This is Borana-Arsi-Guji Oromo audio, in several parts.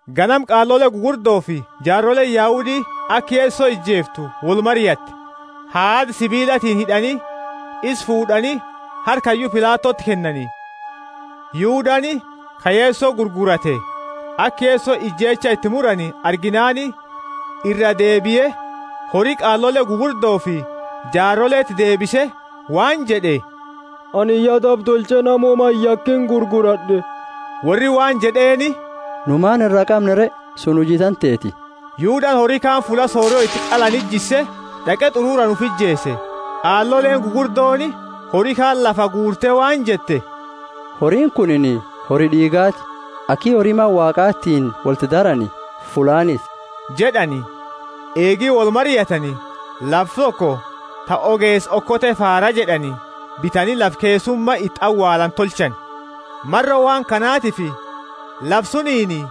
Ganama qaalole gugurdofi jaaroleeni Yahudi aka Yeso ijeeftu wolmariatte. Haada sibiilatiini hid'ani, isa fuud'ani, harka hayyu Pilatoti kennani. Yudani, ka Yeso gurgurate, aka Yeso ijeecha iti murani arginaani, iraa deebie, hori qaalole gugurdofi jaaroleti deebise waan jed'e, Anini ya daba tolche, nama woma iyakini gurgurad'e. Worri waan jed'eeni, Nu maani iraa qamna re? Sunini huji tanteti. Yudani hori kaani fulla sorio iti qalani jisse d'aqe t'ururaani ufi ijeese. Qaaloleeni gugurdooni hori kaani lafaa guurte waan jette, Horiini kunini hori d'iigaati, aki hori Mana Waaqatiini wolti darani fullaaniti jed'ani. Eegi wolmariatani, lafa toko ta Ogeesa Okote Faara jed'ani bitani lafa keessuma iti awaalani tolchani. Maro waan kanatifi lafa suniini,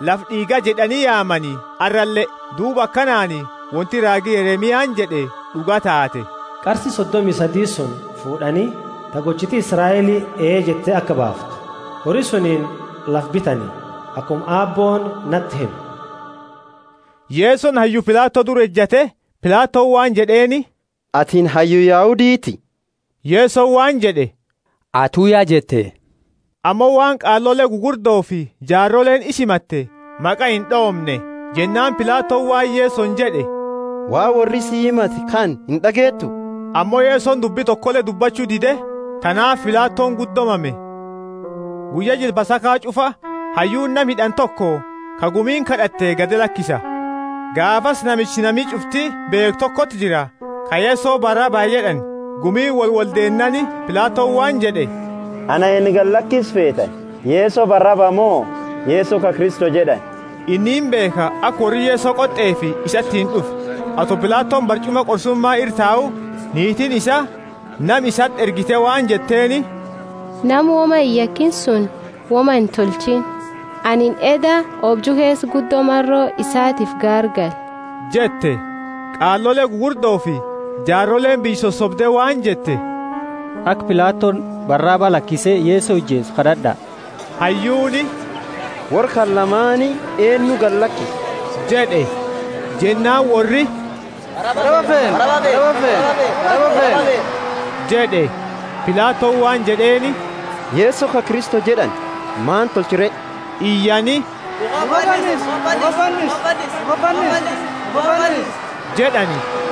Lafa D'iiga jed'ani yaamani, arrale. Duuba akanaani Wonti raagi Yeremiani jed'e d'uga taate: qarsi sodomi sadi suni fuud'ani (ta gochiti Israeli ee jette aka baaftu), hori suniini lafaani bitani, akuma Aabbooni nati hime. Yesoni hayyu Pilato dura ejate, Pilatoni waan jed'eeni, Atini Hayyu Yahuditi? Yesoni waan jed'e, Atu ya jette. Ammo waan qaalole gugurdofi jaaroleeni isa himatte maqa ind'oomne. Jennaani Pilatoni waan Yesoni jed'e, Waan worri si himate kana ind'ageetu? Ammo Yesoni dubbi tokole dubbachu dide, tanaafi Pilatoni guddo mame. Guyya jila Pasaka ch'ufa, hayyuuni nama hid'ani toko, ka gumiini kad'atte, gadi lakisa. Gaafasi namicha nami ch'ufti beekhu tokoti jira, ka Yeso Baraba jed'ani. Gumiini wolwoldeennaani, Pilatoni waan jed'e, Ana eennu gadi lakisu feetani, Yeso Baraba mo Yeso ka Kristo jed'ani? Inni imbeekha, aka worri Yeso qot'efi isatiini d'ufe. Ato Pilatoni barch'uma qorsuma ira tau, niitiini isaa nama isati ergite waan jetteeni, Nama woma iyakini suni woma intolchiini, anini eedda oobju keesa guddo maro isaatiifi gaargale jette. Qaalole gugurdofi jaaroleeni biyya sosobde waan jette, Aka Pilatoni Baraba lakise Yeso ijeesu kad'ad'a. Hayyuuni, Worra kana lamaani eennu gadi lakisa? jed'e, Jennaani worri, Baraba feena jed'e. Pilatoni waan jed'eeni, Yeso ka Kristo jed'ani maani tolcha re? Iyani, Mukhati fannisi jed'ani.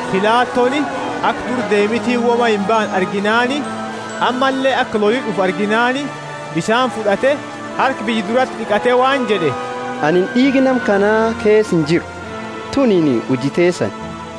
Pilatoni aka dura deemitiini woma imbaane arginaani, ammalle aka loli d'ufu arginaani, bisaani fud'ate, harka biyya durati d'iqate waan jed'e, Anini d'iiga nama kana keesa injiru! Tunini huji teesani!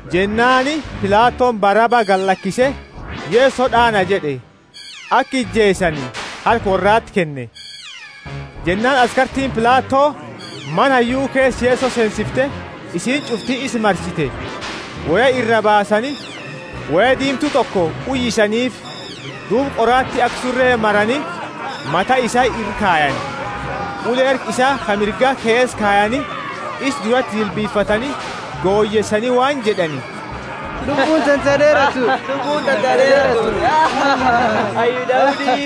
Jennaani Pilatoni Baraba gadi lakise, Yeso d'aana jed'e, aka ijeesani harka worrati kenne. Jennaani askartiini Pilato mana hayyu keesa Yeso seensifte, isiini ch'ufti isa marsite. Woya iraa baasani, woya diimtu toko uyisaniifi. Duuba qoraati aka sure marani mata isaa ira kayani, ule harka isaa ka mirga keesa kayani, isa durati jilbifatani goyeesani waan jed'ani, Lubbuuni tante ha d'eeratuuti, Hayyu Yahudi.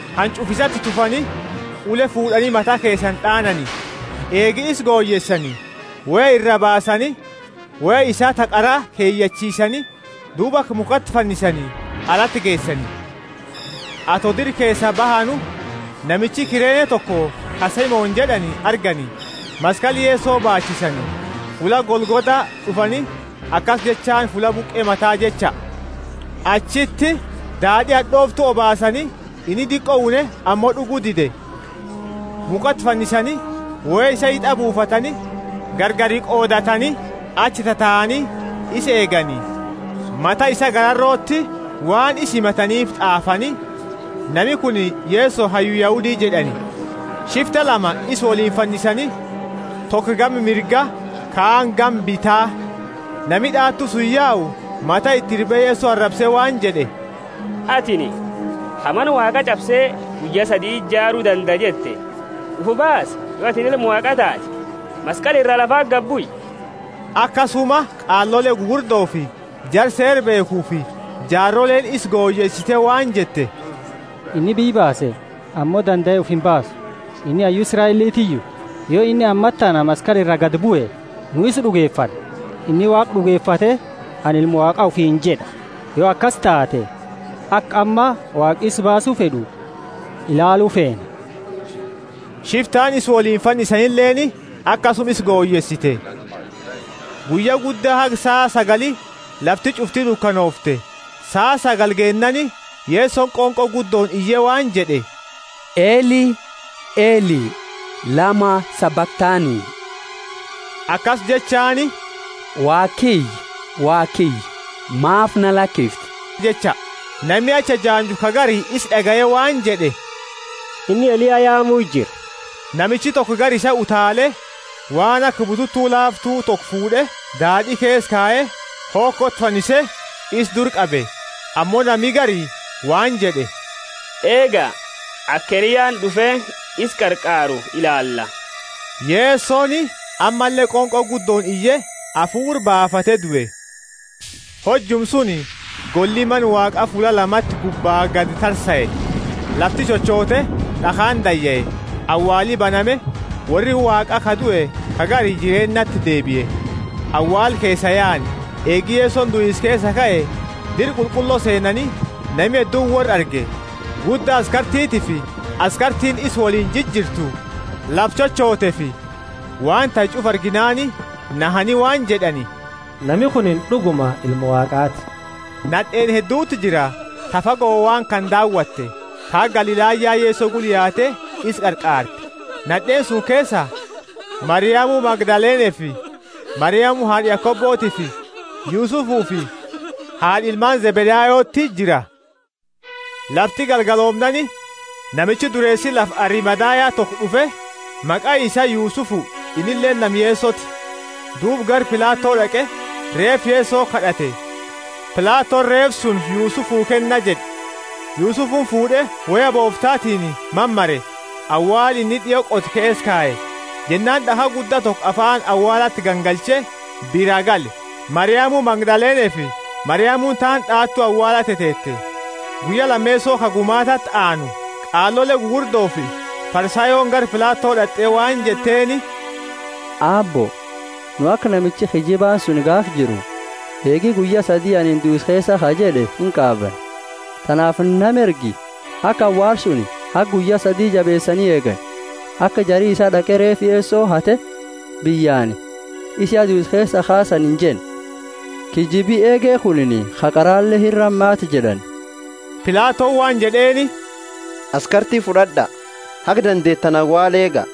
Hanch'ufa isati tufani, ule fuud'ani mata keesani d'aanani. Eegi isa goyeesani, woya iraa baasani, woya isaa ta qara keyachiisani, Duuba aka mukhati fannisani alati geesani. Ato dira keesaa bahanu, namicha Kirene toko ka Simoni jed'ani argani, maskali Yeso baachisani. Fulla Golgotha d'ufani, akasi jechaani Fulla Buqe Mata jecha. Achiti daad'i had'ooftu obaasani, inni diqo une ammo d'ugu dide. Mukhati fannisani, woya isaa hit'a buufatani, gargari qoodatani, achi tataani isa eegani. Mata isaa gararoti waan isa himataniifi t'aafani, Nami kunini Yeso, Hayyu Yahudi jed'ani. Shifta lama isa woliini fannisani, toko gama mirga, kaani gama bita. Nami d'aatu suni yau mata iti irbe Yeso arabse waan jed'e, Atini ka, Mana Waaqa ch'abse, guyya saditi jaaru dandaa jette, ufi baasi, yo atini Ilma Waaqaa taate! Maskali ira lafati gadi bui! Akasuma qaalole gugurdofi jara Seera beekhufi jaaroleeni isa goyeesite waan jette, Inni biyya baase, ammo dandae ufi imbaasu! Inni Hayyu Israelitiyu? Yo inni ammatana maskali ira gadi bue, nu isa d'ugefanna! Inni Waaqa d'ugefate, Anini Ilma Waaqa ufiini jed'a. Yo akasi taate, aka amma Waaqi isa baasu fed'u ilaalu feena. Shiftaani isa woliini fannisanileeni akasuma isa goyeesite. Guyya gudda haga saa sagali lafti ch'ufti dukanoofte. Saa sagali geennaani, Yesoni qonqo guddooni iye waan jed'e, Eli, Eli, lama sabakthani? Akasi jechaani, Waaqa kiyya, Waaqa kiyya, maafi na lakifte? jecha. Nami achi ejaanju ka gari isa d'agaye waan jed'e, Inni Eliya yaamu jira. Namichi toko gara isaa utaale, waan aka bututu laaftu toko fuud'e, daad'i keesa kaye, hokoti fannise, isa dura qabe. Ammo nami gari waan jed'e, Eega, aka Eliyaani d'ufe isa qarqaaru ilaala. Yesoni ammalle qonqo guddooni iye, hafuura baafate due. Hojuma suni golli Mana Waaqa fulla lamati gubba gadi tarsae. Lafti chochote, d'akhaani dayae, awaali baname, worri Waaqa ka due ka gari jireennati deebie. Awaala keesaa yaani, eegi Yesoni duisa keesaa kae, dira qulqullo seenani, nami hedduuni worra arge. Gudda askartitiifi askartiini isa woliini jirjirtu lafa chochoteefi waan tahe ch'ufa arginaani, nahani waan jed'ani, Nami kunini d'uguma Ilma Waaqaati. Nad'eeni hedduti jira, ta fago waan kana daawatte, ta haga Galilaya Yeso gula yaate isa qarqaarte. Nad'eeni suni keesaa, Mariamu Magdalenefi Mariamu haad'a Yakobotiifi Yusufufi haad'a ilmaani Zebedayoti jira. Lafti galgaloomnaani, namichi dureesi lafa Arimathaya toko d'ufe; maqaani isaa Yusufu, innileeni nama Yesoti. Duuba gara Pilato d'aqe, reefa Yeso kad'ate. Pilatoni reefa suni, Yusufu kenna jed'e. Yusufuni fuud'e, woya booftatiini mamare, awaala inni d'io qote keesa kaye. Jennaani d'akha gudda toko afaani awaalati gangalche biraa gale. Mariamu Magdalenefi Mariamuni taani d'aatu awaala teteete. Guyya lameeso, ka gumaatati aanu, qaalole gugurdofi Farisayooni gara Pilato d'at'e, waan jetteeni, Aabbo, nu aka namichi kiyyibaani suni gaafa jiru, Eegi guyya sadi anini duisa keesaa kaa jed'e, inqaabanna. Tanaafi nama ergi, aka awaala suni haga guyya sadi jabeesani eegani, aka jari isaa d'aqe reefa Yeso hate, biyyaani, Isa ya duisa keesaa kaasani injenne. Kiyyibi eege kunini ka qarale ira hamaata jed'ani. Pilatoni waan jed'eeni, Askarti fud'ad'a, haga dandeetani awaala eega.